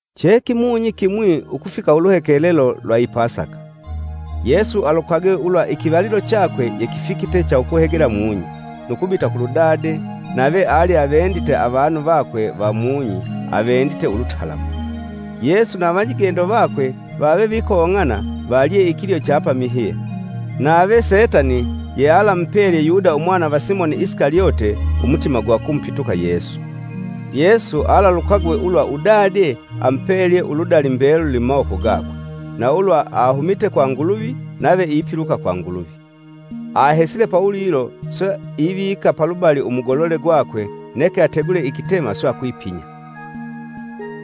Che kimunyi kimwi ukufika uluhekelelo lwa i Pasaka. Yesu alukagwe ulwa ikivalilo chakwe yekifikite cha ukuhegela mung'i, nu kubita kulu Dade nave ali avendite avanu vakwe va mung'i avendite ulutalamu! Yesu na avanyigendo vakwe vave vikong'ana valye ikilyo cha pamihye. Nave Setani yealamupelye Yuda umwana va Simoni Isikalyote umutima gwa kumupituka Yesu. Yesu alalukagwe ulwa udade amupelye uludali mbeluli mumawoko gakwe, na ulwa ahumite kwa Nguluvi nave ipiluka kwa Nguluvi. Ahesile pawulilo, swe ivika palubali umugolole gwakwe neke ategule ikitema swe akwipinya.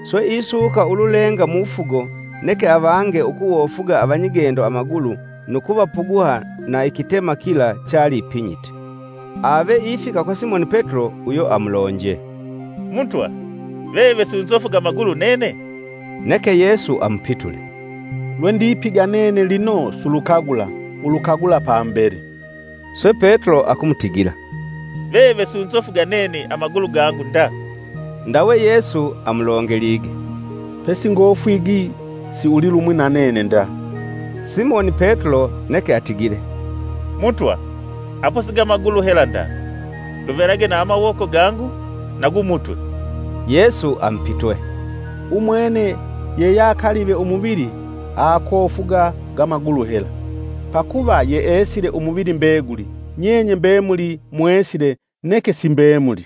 Swe isuuka ululenga mufugo neke avange, ukuwofuga avanyigendo amagulu nu kuvapuguha na ikitema kila chaliipinyite. Ave ifika kwa Simoni Petulo uyo amulonje, “Mutwa, veve sunzofuga amagulu nene?” Neke Yesu amupitule, “Lwendipiga nene lino sulukagula, ulukagula pambele.” Swe Petulo akumutigila, “Veve sunzofuga nene amagulu gangu nda!” Ndawe Yesu amulongelige, “Pesingofwigi siulilumwi na nene nda.” Simoni Petulo neke atigile, “Mutwa apo siga magulu hela nda, luvelage na mawoko gangu na gu mutwe.” Yesu amupitwe, “Umwene yeyakalive umuvili aakofuga ga magulu hela, pakuva yeesile umuvili mbeguli. Nyenye mbemuli mwesile neke si mbemuli.” (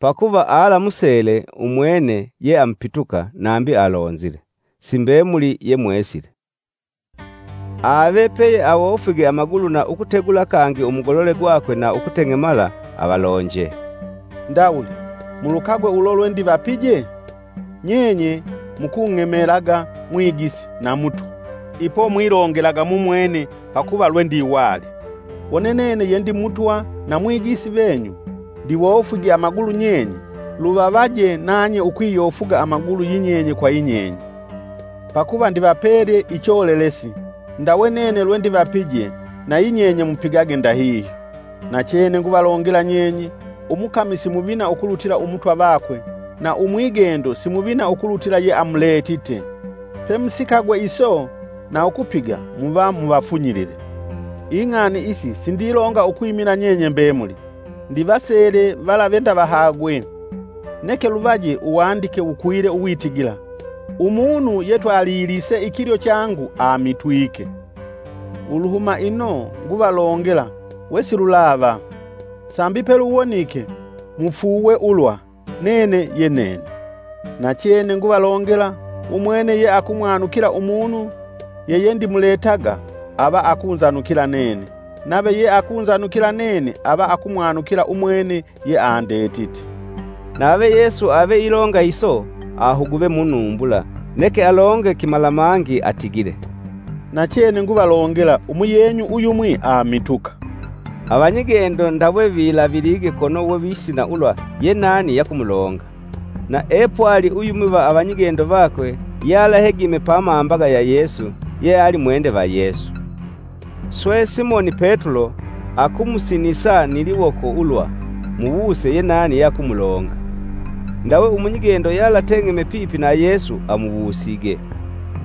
Pakuva alamusele umwene yeamupituka nambi alonzile, “Si mbemuli ye mwesile.”) Ave peye awofwige amagulu na ukutegula kangi umugolole gakwe na ukuteng'emala avalonje, “Ndawuli, mulukagwe ulo lwendivapije? Nyenye mukung'emelaga Mwigisi na Mutwa, ipo mwilongelaga mumwene pakuva lwendiwali. Wone nene ye ndi Mutwa na Mwigisi venyu ndiwofwige amagulu nyenye, luvavaje nanye ukwiyofuga amagulu yinyenye kwa yinyenye. Pakuva ndivapelye icholelesi ndawe nene lwendivapije, nayinyenye mupigage ndahihyo. Nachene nguvalongela nyenye, umukami si muvina ukulutila Umutwa vakwe na umwigendo si muvina ukulutila yeamuletite. Pemusikagwe iso na ukupiga muva muvafunyilile. “Ing'ani isi sindilonga ukwimila nyenye mbemuli, ndivasele vala ve ndavahagwe. Neke luvaje Uwandike wukwile uwitigila; ‘Umunu yetwalilise ikilyo changu amitwike.’ Uluhuma ino nguvalongela wesilulava, sambi peluwonike mufuuwe ulwa, Nene ye Nene. Nachene nguvalongela, umwene yeakumwanukila umunu yeyendimuletaga ava akunzanukila nene, nave yeakunzanukila nene ava akumwanukila umwene yeandetite.” Nave Yesu ave ilonga iso ahuguve munumbula, neke alonge kimalamangi atigile, “Nachene nguvalongela umuyenyu uyumwi amituka.” Avanyigendo ndawe vilavilige kono wevisina ulwa yenani yakumulonga. Na epwali uyumwi va avanyigendo vakwe yealahegime pamambaga ya Yesu, yeali mwende va Yesu. Swe Simoni Petulo akumusinisa ni liwoko ulwa, “Muwuse yenani yeakumulonga.” Ndawe umunyigendo yealateng'eme pipi na Yesu amuwusige,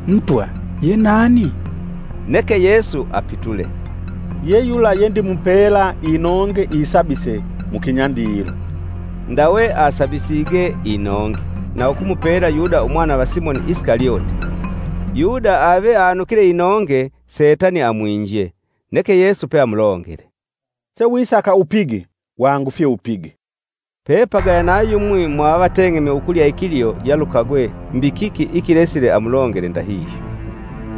“Mutwa, ye nani?” Neke Yesu apitule, “Ye yula yendimupela inonge isabise mu kinyandilo,” Ndawe asabisige inonge na ukumupela Yuda umwana va Simoni Isikalyote. Yuda ave anukile inonge, Setani amwinje. Neke Yesu peamulongele, “Sewisaka upige; wangufye upige!” Pepagaya na yumwi mwaavevateng'eme ukulya ikilyo yalukagwe mbi kiki ikilesile amulongele ndahihyo.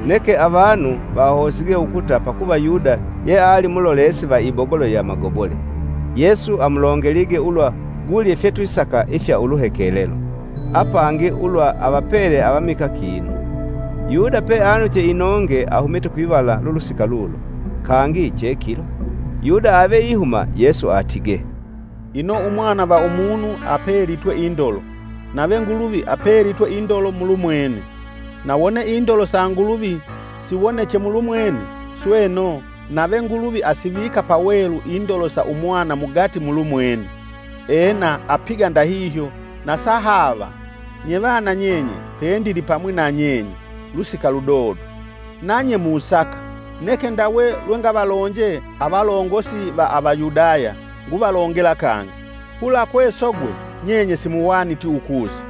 Neke avanu vahosige ukuta pakuva Yuda yeali mulolesi va ibogolo ya magobole, Yesu amulongelige ulwa gule fyetwisaka ifya uluhelelo, apangi, ulwa avapele avamikaa kinu. Yuda peanuche inonge ahumite kwivala lulusika lulo. Kangi che kilo. Yuda ave ihuma Yesu atige, “Ino Umwana va Umunu apelitwe indolo; nave Nguluvi apelitwe indolo mulumwene. Na wone indolo sa Nguluvi siwoneche mulumwene, sweno, nave Nguluvi asivika pawelu indolo sa Umwana mugati mulumwene, ena apiga ndahihyo na sahaava. “Nye vana nyenye pendilipamwi na nyenye, lusika ludodo. Nanye musaka, neke ndawe lwe ngavalonje avalongosi va Avayudaya, nguvalongela kangi, ‘Kula kwesogwe nyenye simuhwaniti ukusa!’.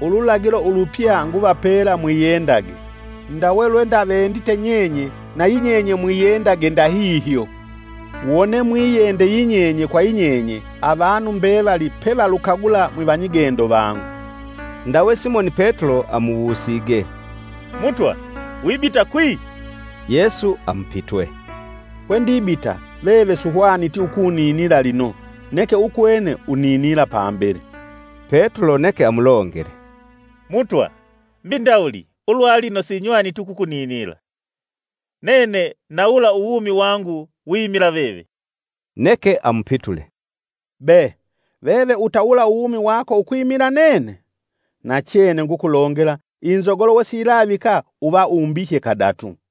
Ululagilo ulupya nguvapela mwiyendage, ndawe lwe ndavendite nyenye na yinyenye mwiyendage ndahihyo. Wone mwiyende yinyenye kwa yinyenye avanu mbevali pevalukagula mwivanyigendo vangu.” Ndawe Simoni Petulo amuwusige, “Mutwa wibita kwi?” Yesu amupitwe, “Kwendibita veve suhwaniti ukuninila lino neke ukwene uninila pambele.” Petulo neke amulongele, “Mutwa mbi ndawuli ulwalino sinywaniti ukuninila!” Nene nawula uwumi wangu wimila veve. Neke amupitule “Be, veve utawula uwumi wako ukwimila nene? Nachene ngukulongela inzogolo wesiyilavika uva umbihye kadatu!”